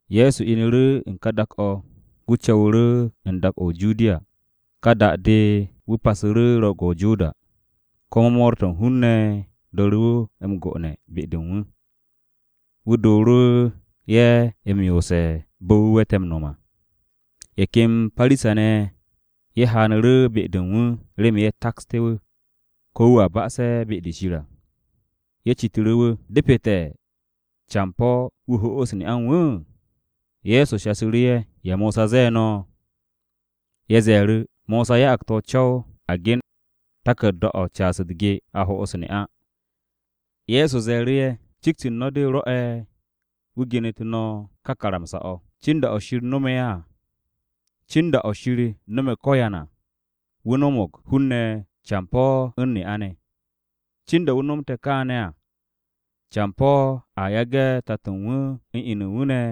Ye̱so inu̱ru̱ u̱n ká dak-o̱, wu̱ co̱wu̱ru̱ u̱n dak-o̱ o-Judiya, ka da-de wu̱ passu̱ru̱ Ro̱o̱g-o̱ o-Joda. Komo mo̱o̱r-to̱ u̱n hun-ne̱ dooru̱ m-go'one̱ be-de u̱n wu̱. Wu̱ dooru̱ ye̱ m-yoose̱ bo̱ wu̱ we̱te̱ m-no̱m à. Ye̱ ken Parisa-ne̱ ye̱ haanu̱ru̱ be-de u̱n wu̱ remen ye̱ taksté̱ wu̱, ko̱ wu̱a ba'ase̱ be-de Shir à. Ye̱ citu̱ru̱ wu̱, “¿Depete̱ campo̱ wu̱ ho'os ne'a u̱n wu̱?” Ye̱so shasu̱ru̱ ye̱, “¿Ya Mosa ze̱e̱ no̱?” Ye̱ ze̱e̱ru̱, “Mosa ya'ag te̱ o-co̱w a gen taku̱rda-o̱ u̱n caas u̱t-ge, a ho'os ne'a.” Ye̱so ze̱e̱ru̱ ye̱, “Cikt u̱n no̱ de rwo̱'e̱ wu̱ genetu̱ no̱ kà karamsa-o̱. Cin da-o̱ Shir no̱me̱ ko̱yan à, ‘Wu̱ no̱mo̱g hun-ne̱ campo̱ u̱n ne'a ne̱.’ Cin da wu̱ nomte̱ na kaane̱ à, ‘Campo̱ a yage̱ tato u̱n wu̱ u̱n inu u̱n wu̱ ne̱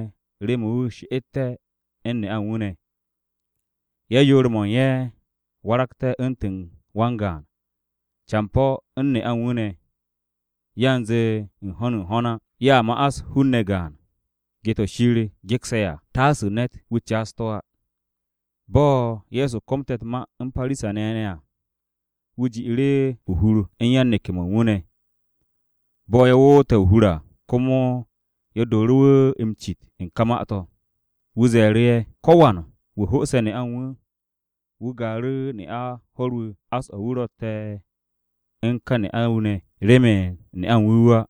remen wu̱ she'etté̱ u̱n ne'a u̱n wu̱ ne̱. Ye̱, yoor-ye̱ waragte̱ u̱ntu̱n wan-gaan’ campo̱ u̱n ne'a u̱n wu̱ ne̱, yanze u̱n ho̱n u̱n ho̱n á. Ye̱a ma'as hun-ne̱ gaan. Ge-to̱ Shir gekse̱ à, taasu̱ ne̱t, wu̱ caas to̱ á.” Bo̱ Ye̱so komte̱ u̱t-ma u̱n Parisa-ne̱ ne̱ à, wu̱ ji'iru̱ o-hur u̱n yan-neke̱-mo̱ u̱n wu̱ ne̱. Bo̱ ye̱ woote̱ o-hur à, komo ye̱ dooru̱ wu̱ m-cit u̱n ka ma-to̱. Wu̱ ze̱e̱ru̱ ye̱, “Ko̱wan wu̱ ho'ose̱ ne'a u̱n wu̱, wu̱ gaaru̱ ne'a ho̱r-wu̱, ás-o̱ wu̱ ro̱tte̱ u̱n ka ne'a-wu̱ ne̱, remen ne'a u̱n wu̱ wu̱ á.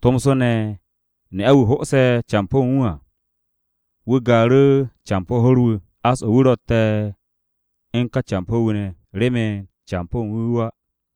Tomso ne̱ ne'a-wu̱ ho'ose̱ campo̱ u̱n wu̱ à, wu̱ gaaru̱ campo̱ ho̱r-wu̱, ás-o̱ wu̱ ro̱tte̱ u̱n ka campo̱-wu̱ ne̱, remen campo̱ u̱n wu̱ wu̱ á.”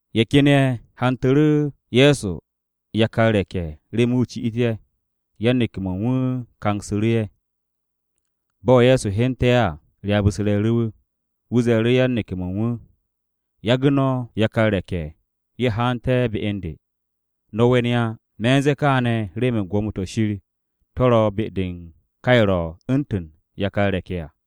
Ye̱ ken ye̱ hantu̱ru̱ Ye̱so yakar re̱k-ye̱ remen wu̱ ci'it ye̱. Yan-neke̱-mo̱ u̱n wu̱ kangsu̱ru̱ ye̱. Bo̱ Ye̱so hyente̱ à, ryaab-u̱s re̱e̱ru̱ wu̱. Wu̱ ze̱e̱ru̱ yan-neke̱-mo̱ u̱n wu̱, “Yage̱ no̱ yakar re̱k-ye̱ ye̱ haante̱ be u̱n de. No̱ we̱n ye̱ á. Me̱ u̱n ze̱e̱ kaane̱ remen Gwo̱mo-to̱ Shir to̱ ro̱ be-de u̱n ka ye̱ ro̱ u̱ntu̱n yakar re̱k-ye̱ à.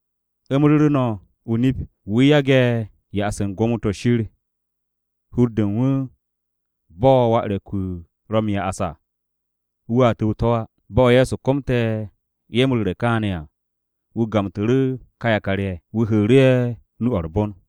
Nip-o̱ me̱ no̱ m-ru̱re̱, wu̱ yage̱ ya'as u̱n gwo̱mo-to̱ Shir hur-de u̱n wu̱ bo̱ wà re̱k-wu̱ ro̱ m-ya'as à, wu̱ á tu̱w u̱n to̱ á.” Bo̱ Ye̱so komte̱ ye̱ m-ru̱re̱ kaane̱ à, wu̱ gamtu̱ru̱ ka yakar-ye̱. Wu̱ hu̱u̱ru̱ ye̱ nu-o̱ u̱r-bon.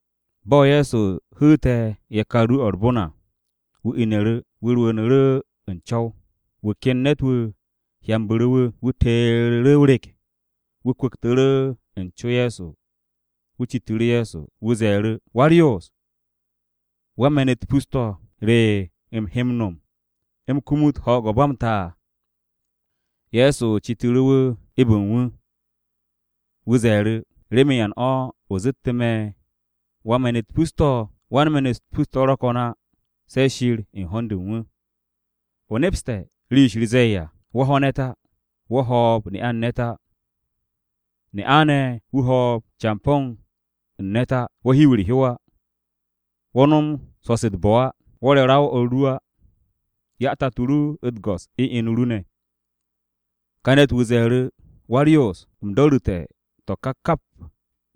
Bo̱ Ye̱so hu̱u̱te̱ yakar nu-o̱ u̱r-bon à, wu̱ inu̱ru̱, wu̱ rwu̱u̱nu̱ru̱ u̱n co̱w. Wu̱ ken ne̱t-wu̱ hyambu̱ru̱ wu̱. Wu̱ teeru̱ru̱ o-rek. Wu̱ kwu̱ktu̱ru̱ u̱n co Ye̱so, wu̱ citu̱ru̱ Ye̱so. Wu̱ ze̱e̱ru̱, “Wa-u̱r-Yoos, wan-me̱n-u̱t pus-to̱, ¿re u̱m he m-no̱m u̱m kumut ho̱o̱g-o̱ ba m-ta?” Ye̱so citu̱ru̱ wu̱ eb u̱n wu̱, wu̱ ze̱e̱ru̱, “¿Remen ya u̱n o̱ o zettu̱ me̱ wan-me̱n-u̱t pus-to̱? Wan-me̱n-u̱t pus-to̱ ro̱ ko̱n á, se̱ Shir u̱n ho̱n-de u̱n wu̱. O nepse̱ rii-yo Shir zee à: ‘Wo̱ ho̱ ne̱t á. Wo̱ ho̱o̱b ne'a-wu̱ u̱n ne̱t á, ne'a ne̱ wu̱ ho̱o̱b campo̱ wu̱ u̱n ne̱t á. Wo̱ hiw u̱r-hyow á. Wo̱ no̱m swo̱-se u̱t-bo̱ á. Wo̱ re̱ ra-o o̱r ru á, 'ya tato ru u̱t-go̱s u̱n inu ru ne̱.’” Ka ne̱t-wu̱ ze̱e̱ru̱, “Wa-u̱r-Yoos, u̱m do̱ru̱te̱ to̱ ka kap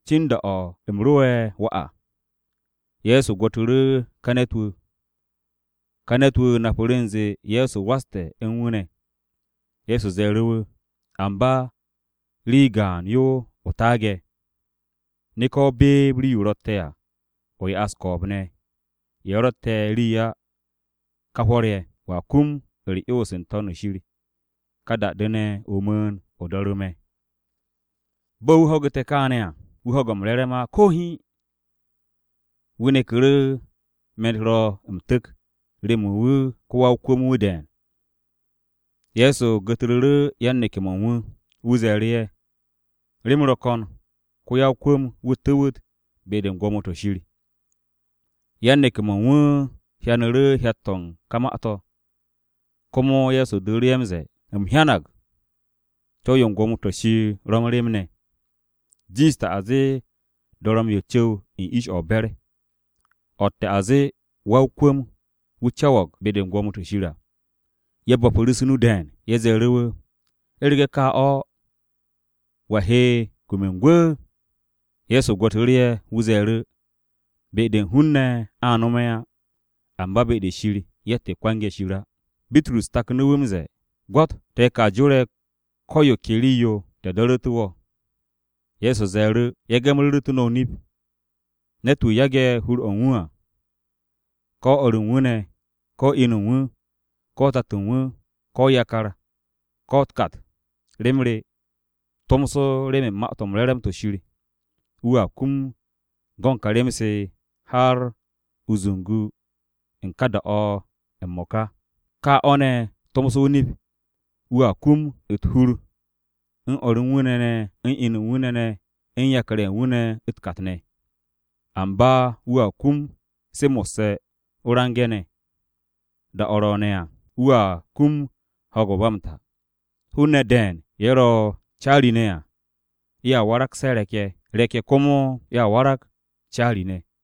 cin da-o̱ u̱m ro'e̱ wà à.” Ye̱so gwo̱tu̱ru̱ ka ne̱t-wu̱, ka ne̱t-wu̱ napu̱ru̱ u̱nze Ye̱so waste̱ u̱n wu̱ ne̱. Ye̱so ze̱e̱ru̱ wu̱, “Amba rii gaan yo o taage̱. Neke̱ o beeb rii-yo o ro̱tte̱ à, o ya'as ko̱o̱b-ne̱ ye̱ ro̱tte̱ rii á ka hwo̱r-ye̱. Wo̱a kum u̱r-'yons n-To̱n shir. Ka da-de ne̱, o mu̱u̱n, o do̱ru̱ me̱.” Bo̱ wu̱ ho̱gu̱te̱ kaane̱ à, wu̱ ho̱ge̱ m-re̱re̱m á ko̱ hiin. Wu̱ neku̱ru̱ me̱n-u̱t ro̱ m-tu̱k remen wu̱ wa-o-kwu̱m-wu̱ de̱e̱n. Ye̱so gu̱tru̱ru̱ yan-neke̱-mo̱ u̱n wu̱. Wu̱ ze̱e̱ru̱ ye̱, “Rem ro̱ ko̱n ko-ya-o-kwu̱m-wu̱ tu̱wu̱t be-de u̱n gwo̱mo-to̱ Shir.” Yan-neke̱-mo̱ u̱n wu̱ hyanu̱ru̱ hyat-to̱ u̱n ka ma-to̱. Komo Ye̱so dooru̱ ye̱ m-ze̱e̱, “U̱m hyanag co̱w u̱n gwo̱mo-to̱ Shir ro̱ u̱n rem ne̱. Jiishte̱ a zee dorom-yo cu̱w u̱n ish-o̱ o-be̱r, o̱tte̱ a zee wa-o-kwu̱m-wu̱ cu̱w be-de u̱n gwo̱mo-to̱ Shir à.” Ye̱ bo̱pu̱ru̱ u̱s-nu de̱e̱n. Ye̱ ze̱e̱ru̱ wu̱, “U̱rege̱ ka o̱, ¿wa he kum u̱n gwu̱?” Ye̱so gwo̱tu̱ru̱ ye̱. Wu̱ ze̱e̱ru̱, “Be-de u̱n hun-ne̱ a nome̱ á. Amba be-de Shir, yatt-yo kwange̱ Shir á.” Bitrus taknu̱ wu̱ m-ze̱e̱, “Gwo̱t, te̱ ka jore̱ ko̱ yo ke rii-yo, te̱ do̱ru̱te̱ wo̱.” Ye̱so ze̱e̱ru̱, “Nip-o̱ me̱ no̱ m-ru̱re̱, ne̱t-wu̱ yage̱ hur-o̱ u̱n wu̱ à, ko̱ o̱r u̱n wu̱ ne̱, ko̱ inu u̱n wu̱, ko̱ tato u̱n wu̱, ko̱ yakar, ko̱ u̱t-kat, rem re, tomso remen Ma-to̱ m-Re̱re̱m to̱ Shir, wu̱a kum go̱n ka rem-se har o-zungu u̱n ka da-o̱ m-mo̱ka. Ka o̱ ne̱ tomso o-nip wu̱a kum u̱t-hur u̱n o̱r u̱n wu̱ ne̱ ne̱ u̱n inu u̱n wu̱ ne̱ ne̱ u̱n yakar ne̱ u̱t-kat ne̱. Amba wu̱a kum se mo̱sse̱ o-range̱ ne̱. Da-o̱ ro̱o̱ne̱ ne̱ à, wu̱a kum ho̱o̱g-o̱ ba m-ta. Hun-ne̱ de̱e̱n ye̱ ro̱ caari-ne̱ à, ye̱a waragse̱ re̱k-ye̱. Re̱k-ye̱ komo warag caari-ne̱.”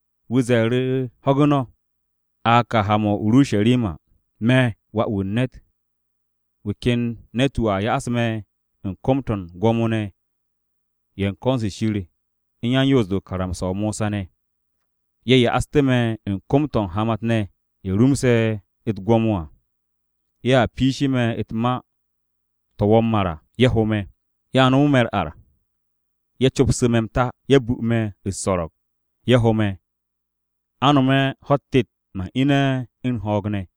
Wu̱ ze̱e̱ru̱ ho̱gu̱ no̱, “A ka m-ha o-Urusharima. Me̱ Wà-wu̱ u̱n ne̱t, wu̱ ken ne̱t-wu̱ a ya'as me̱ u̱n kom-to̱ u̱n Gwo̱mo-ne̱ ye̱ u̱n ko̱n-se Shir u̱n yan-Yoos-de u̱n karamsa-o Mosa ne̱. Ye̱ ya'aste̱ me̱ u̱n kom-to̱ u̱n hamat-ne̱ ye̱ rumse̱ u̱t-gwo̱mo à, ye̱a piishe̱ me̱ ma-to̱ wo̱o̱ m-mar à, ye̱ ho me̱. Ye̱a nomo me̱ u̱r-ar, ye̱ copsu̱ me̱ m-ta, ye̱ bu me̱ u̱s-so̱ro̱g, ye̱ ho me̱. A nome̱ ho̱-u̱t tet, man ine̱ u̱n ho̱o̱g ne̱.”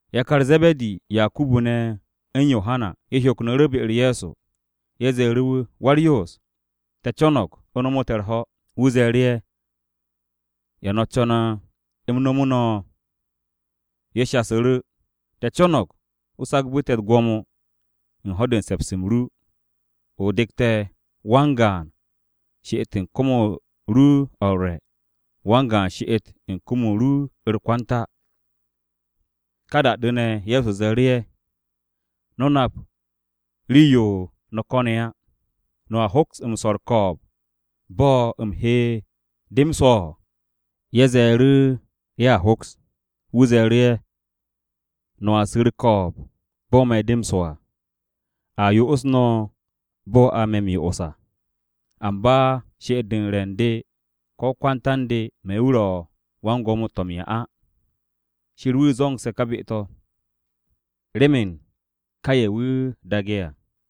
Yakar Ze̱be̱di, Yakubu ne̱, u̱n Yohana, ye̱ hyoknu̱ru̱ be-u̱r Ye̱so. Ye̱ ze̱e̱ru̱ wu̱, “Wa-u̱r-Yoos, te̱ co̱no̱g o nomu̱ te̱ u̱r-ho̱.” Wu̱ ze̱e̱ru̱ ye̱, “¿Ya no̱ co̱ne̱ u̱m nomu̱ no̱?” Ye̱ shasu̱ru̱, “Te̱ co̱no̱g, a sagbe̱ wo̱ u̱t-gwo̱mo, u̱n ho̱-de u̱n se̱ps-m ru, o dek te̱, wan-gaan she'et u̱n kom-o ru o̱ u̱r-re̱, wan-gaan she'et u̱n kom-o̱ u̱r-kwanta.” Ka da-de ne̱, Ye̱so ze̱e̱ru̱ ye̱, “No̱ nap rii-yo no̱ ko̱ne̱ á. ¿No̱a hoks swo̱ u̱r-ko̱o̱b bo̱ u̱m he de m-swo̱?” Ye̱ ze̱e̱ru̱ ye̱a hoks. Ye̱so ze̱e̱ru̱, “No̱a su̱ u̱r-ko̱o̱b, bo̱ me̱ de m-swo̱ à. A yo'os no̱ bo̱ a he me̱ m-yo'os à. Amba she'et-de u̱n re̱ u̱n de ko̱ kwanta u̱n de me̱ wu̱ ro̱ wan-gwo̱mo-to̱ m-'ya á. Shir wu̱ zo̱nge̱ ka be-to̱, remen ká ye̱ wu̱ daage̱ à.”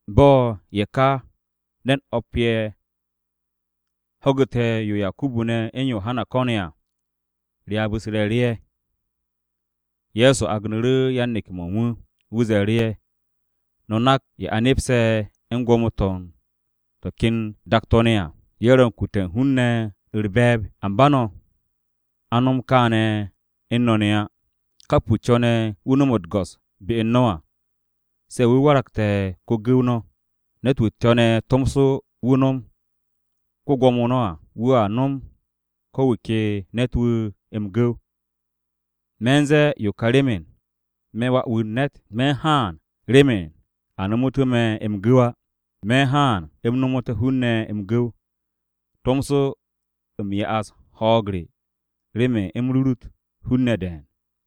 Bo̱ ye̱ ka ne̱n o̱p-ye̱ ho̱gu̱te̱ yo Yakubu ne̱ u̱n Yohana ko̱ne̱ à, ryaab-u̱s re̱e̱ru̱ ye̱. Ye̱so agnu̱ru̱ yan-neke̱-mo̱ u̱n wu̱. Wu̱ ze̱e̱ru̱ ye̱, “No̱ nak ye̱ a nepse̱ u̱n gwo̱mo-to̱ u̱n to̱ ken dak-to̱ ne̱ à, ye̱ ro̱ u̱n kute̱ u̱n hun-ne̱ u̱r-be̱e̱b. Amba no̱, a nom kaane̱ u̱n no̱ ne̱ á. Kap wu̱ co̱ne̱ wu̱ nom u̱t-go̱s be u̱n no̱ à, se̱ wu̱ waragte̱ ko-gu̱w no̱. Ne̱t-wu̱ co̱ne̱ tomso wu̱ nom ko-Gwo̱mo no̱ à, wu̱a nome̱ ko̱ wu̱ ke ne̱t-wu̱ m-gu̱w. Me̱ u̱n ze̱e̱ yo ka remen, me̱ Wà-wu̱ u̱n ne̱t, me̱ u̱n haan remen a nomu̱tú̱ me̱ m-gu̱w á. Me̱ u̱n haan u̱m nomu̱té̱ hun-ne̱ m-gu̱w, tomso u̱m ya'as ho̱o̱g re remen u̱m rurut hun-ne̱ de̱e̱n.”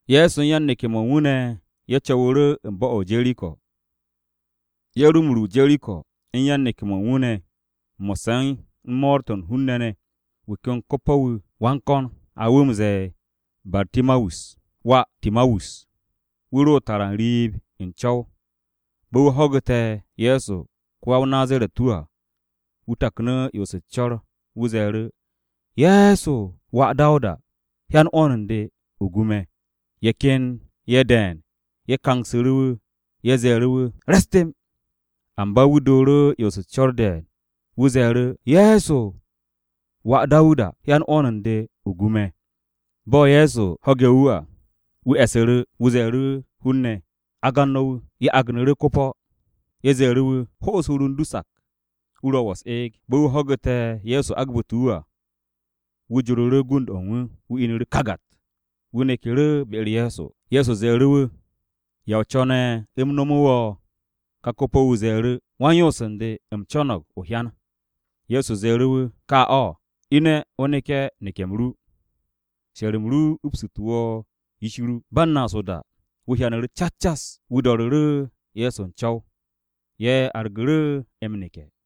Ye̱so u̱n yan-neke̱-mo̱ u̱n wu̱ ne̱ ye̱ co̱wu̱ru̱ u̱n bo̱-o̱ o-Jeriko. Ye̱ ro m-ru o-Jeriko u̱n yan-neke̱-mo̱ u̱n wu̱ ne̱ mo̱sse̱ u̱n mo̱o̱r-to̱ u̱n hun-ne̱ ne̱. Wu̱ ken ko-po̱-wu̱, wa u̱s-ko̱n, a wu̱ m-ze̱e̱ Bartimawus (wà Timawus) wu̱ ro tara n-riib u̱n co̱w. Bo̱ wu̱ ho̱gu̱te̱ Ye̱so ko-ya-o-Nazaret-wu̱ à, wu̱ taknu̱ 'yons u̱s-co̱r. Wu̱ ze̱e̱ru̱, “Ye̱so, wà Dawuda, hyan 'wo̱n u̱n de, o gu me̱!” Ye̱ ken ye̱ de̱e̱n ye̱ kangsu̱ru̱ wu̱, ye̱ ze̱e̱ru̱ wu̱, “Re̱s temb!” Amba wu̱ dooru̱ 'yons u̱s-co̱r de̱e̱n. Wu̱ ze̱e̱ru̱, “Ye̱so, wà Dawuda, hyan 'wo̱n u̱n de, o gu me̱!” Bo̱ Ye̱so ho̱ge̱ wu̱ à, wu̱ e̱su̱ru̱. Wu̱ ze̱e̱ru̱ hun-ne̱, “Agan no̱ wu̱.” Ye̱ agnu̱ru̱ ko-po̱. Ye̱ ze̱e̱ru̱ wu̱, “Ho'os hur u̱n du sak. Wu̱ ro̱ wo̱ u̱s-eeg.” Bo̱ wu̱ ho̱gu̱te̱ Ye̱so agbu̱te̱ wu̱ à, wu̱ joru̱ru̱ gund-o̱ u̱n wu̱, wu̱ inu̱ru̱ kagat, wu̱ neku̱ru̱ be-u̱r Ye̱so. Ye̱so ze̱e̱ru̱ wu̱, “¿Ya o co̱ne̱ u̱m nomu̱ wo̱?” Ka ko-po̱-wu̱ ze̱e̱ru̱, “Wan-yoos u̱n de, u̱m co̱no̱g o-hyan.” Ye̱so ze̱e̱ru̱ wu̱, “Ka o̱. Ine̱ o neke̱ neke̱-m ru. She̱r-m ru upsu̱tu̱ wo̱ yish ru.” Ba u̱n naas o-da, wu̱ hyanu̱ru̱ cas cas. Wu̱ do̱ru̱ru̱ Ye̱so u̱n co̱w. Ye̱ argu̱ru̱ m-neke̱.